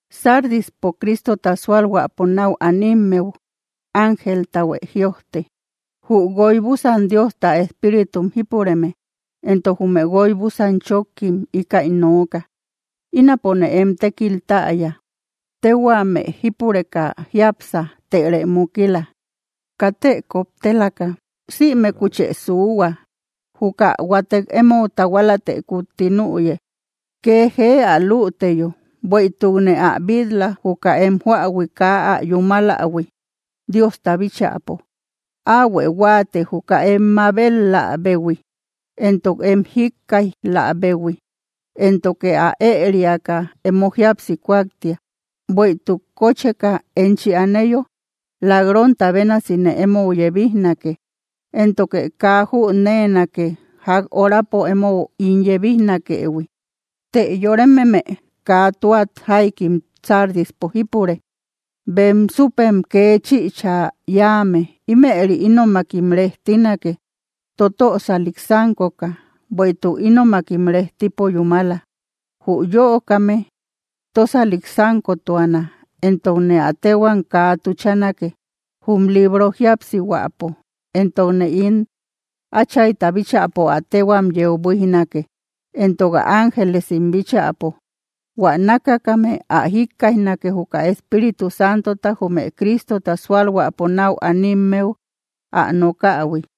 ’Sardispo Cristota sualhuäpo nau animmeu ángeltahuë jïojte: “Jü guoy búsan Diosta espíritum jípureme, entok jume guoy búsan chókkim, íkäi nooka: Ínapone em tékil täya. Téhuame jípureka jiápsa, tërë mukila. ¡Katë koptelaka sïmekuchë suuhua! Juka huatek emou tahualatë kutti nüye, kee jee ä lüteyo. Bueïtukne ä bil-la, juka em joähui kaa ä yúmalähui, Diosta bíchäpo. Áuhuë huáate, juka em mabet‑läbehui, entok em jíkkaij‑läbehui; éntoke ä ëeriaka emo jíapsi kuaktia. Bueïtuk kocheka enchi aneyo, lak‑ronta bénasine emou yebijnake. Éntoke kaa jüneenake ják horapo emou ín yebijnakëhui. Të yorememe kaa tua jaikim Sardispo jípure, bem súpem kee chïcha yáame. Ímëri ínomakim rejtinake, totösalik sánkoka. Bueïtuk ínomakim rejtipo yúmala. Jü yöokame tósalik sánkotuana entokne ä téhuam kaa tuchanake, jum libro jíapsihuäpo; entokne ín Áchayta bíchäpo ä téhuam yeu buíjnake, entok ä ángelesim bíchäpo. Huä nákakame ä jikkaijnake, juka Espíritu Santota jume Cristota sualhuäpo nau animmeu ä nokähui.”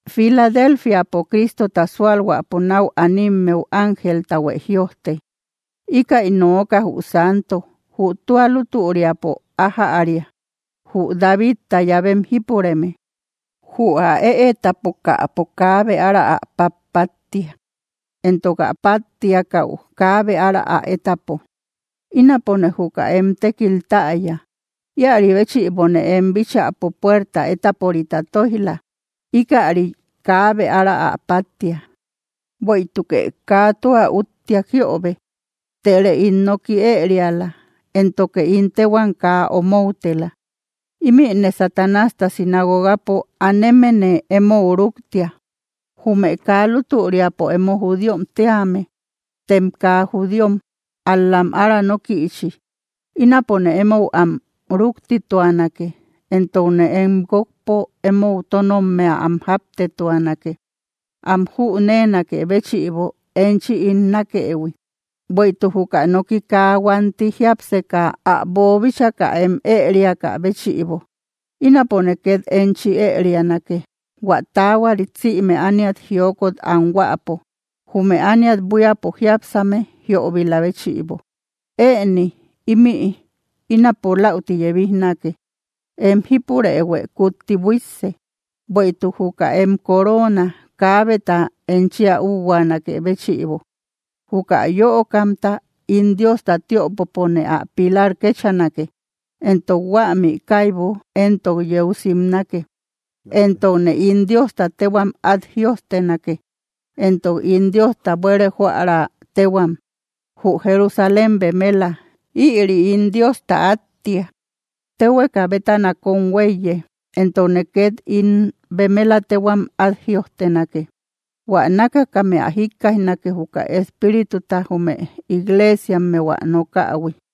’Filadelfiapo Cristota sualhuäpo nau animmeu ángeltahuë jïojte: “Íkäi nooka jü santo, jü tua lútüriapo ájäria, jü Davidta llavem jípureme. Jü ä ëetapokäpo, kaabe ára ä pát‑páttia; entok ä páttiakäu, kaabe ára ä étapo: Ínapone juka em tékil täya. Íäri béchïbone em bíchäpo puerta étaporita tóij‑la. Íkäri kaabe ára ä páttia. Bueïtukë kaa tua úttiak jiöbe, tërë ín noki ëeriala, éntoke ín téhuam kaa omoutela. Ímïne Satanásta sinagogapo anemene emou rúktia, jume kaa lútüriapo emo judíom tíame, tem kaa judíom, ál‑lam ára nókïchi. Ínapone emou am rúktituanake, entokne em guókpo emou tónnommea am jáptetuanake, am jüneenakë béchïbo, enchi ín nákëhui. Bueïtuk juka noki kaa huanti jiapseka ä bobitchaka em ériakä béchïbo, ínapo ket enchi érianake, hua taahuarit sïme ániat jiokot anhuäpo, jume ániat buíapo jiápsame jiöbila béchïbo. Ëni ímï, ínapo läuti yebijnake. Em jípurëhuë kutti buísse, bueïtuk juka em coorona, kaabeta enchi ä úhuaanakë béchïbo. Juka yöokamta, ín Diosta tiöpopone ä pilar kechanake, entok huämi kaibu éntok yeu simnake. Entokne ín Diosta téhuam át jïojtenake, entok ín Diosta buére jóära téhuam, jü Jerusalén bemela. Ïri ín Diosta áttia, téhueka bétana kóm huéiye. Entokne ket ín bemela téhuam át jïojtenake. Huä nákakame ä jikkaijnake, juka Espírituta jume igleesiammeu ä nokähui.”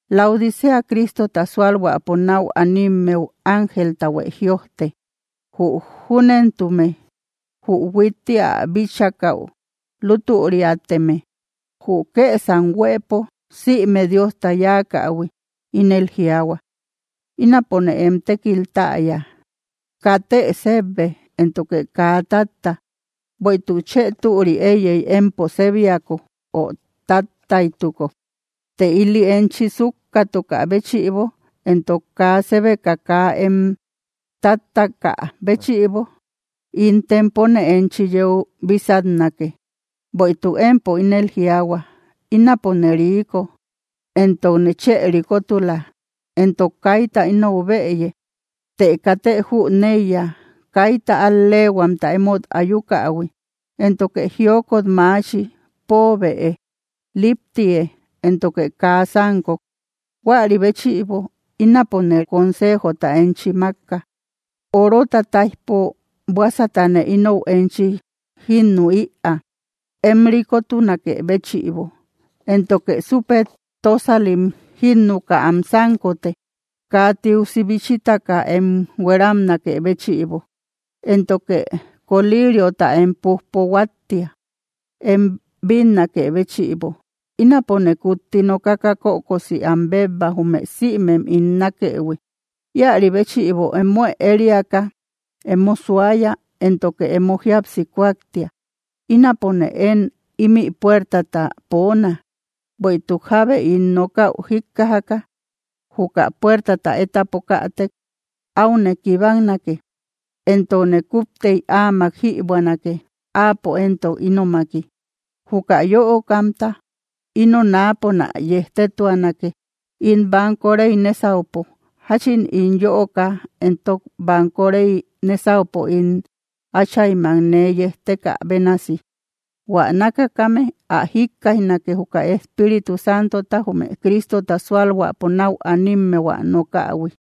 ’Laodicea Cristota sualhuäpo nau animmeu ángeltahuë jïojte: “Jü júnentume, jü huitti ä bíchakäu lútüriateme, jü kësam huëpo sïme Diosta yáakähui, ínel jiaahua: Ínapone em tékil täya. Katë sébbe, éntoke kaa tátta. ¡Bueïtuk chë türi éiyey, empo sébiako, o táttaytuko! Të ili enchi súkkatukä béchïbo entok kaa sébeka kaa em táttaakä béchïbo, ín tempone enchi yeu bísatnake. Bueïtuk empo ínel jiaahua: Ínapone riiko, entokne chë rikotula, entok kaita inou bëye. Të katë jüneiya, kaita al‑leehuamta emót ayuakähui, éntoke jiokot maachi. Poobëe, líptïe, éntoke kaa sánkok. Huäri béchïbo ínapone consejota enchi mákka: orota táijpo buásatane inou enchi jínnü ïaa, em rikotunakë béchïbo. Éntoke súpe tósalim jínnuka am sánkote, kaa tiusi bichitaka em hueramnakë béchïbo. Éntoke koliiriota em pújpo huáttia, em bínnakë béchïbo. Ínapone kutti nokaka kökosi am bébba, jume sïmem ín nákëhui. Íäri béchïbo emuë ériaka, emo suaya éntoke emo jíapsi kuaktia. Ínapone én ímï puertata poona. Bueïtuk jábe ín nokäu jíkkajaka, juka puertata étapokätek, áune kibaknake, entokne kúptey áamak jïbuänake áapo entok ínomaki. Juka yöokamta, íno náaponä yejtetuanake, ín banko rey nésaupo, jachin ín yöoka entok banko rey nésaupo ín Áchaymak nee yejtekä bénasi. Huä nákakame ä jikkaijnake, juka Espíritu Santota jume Cristota sualhuäpo nau animmeu ä nokähui.”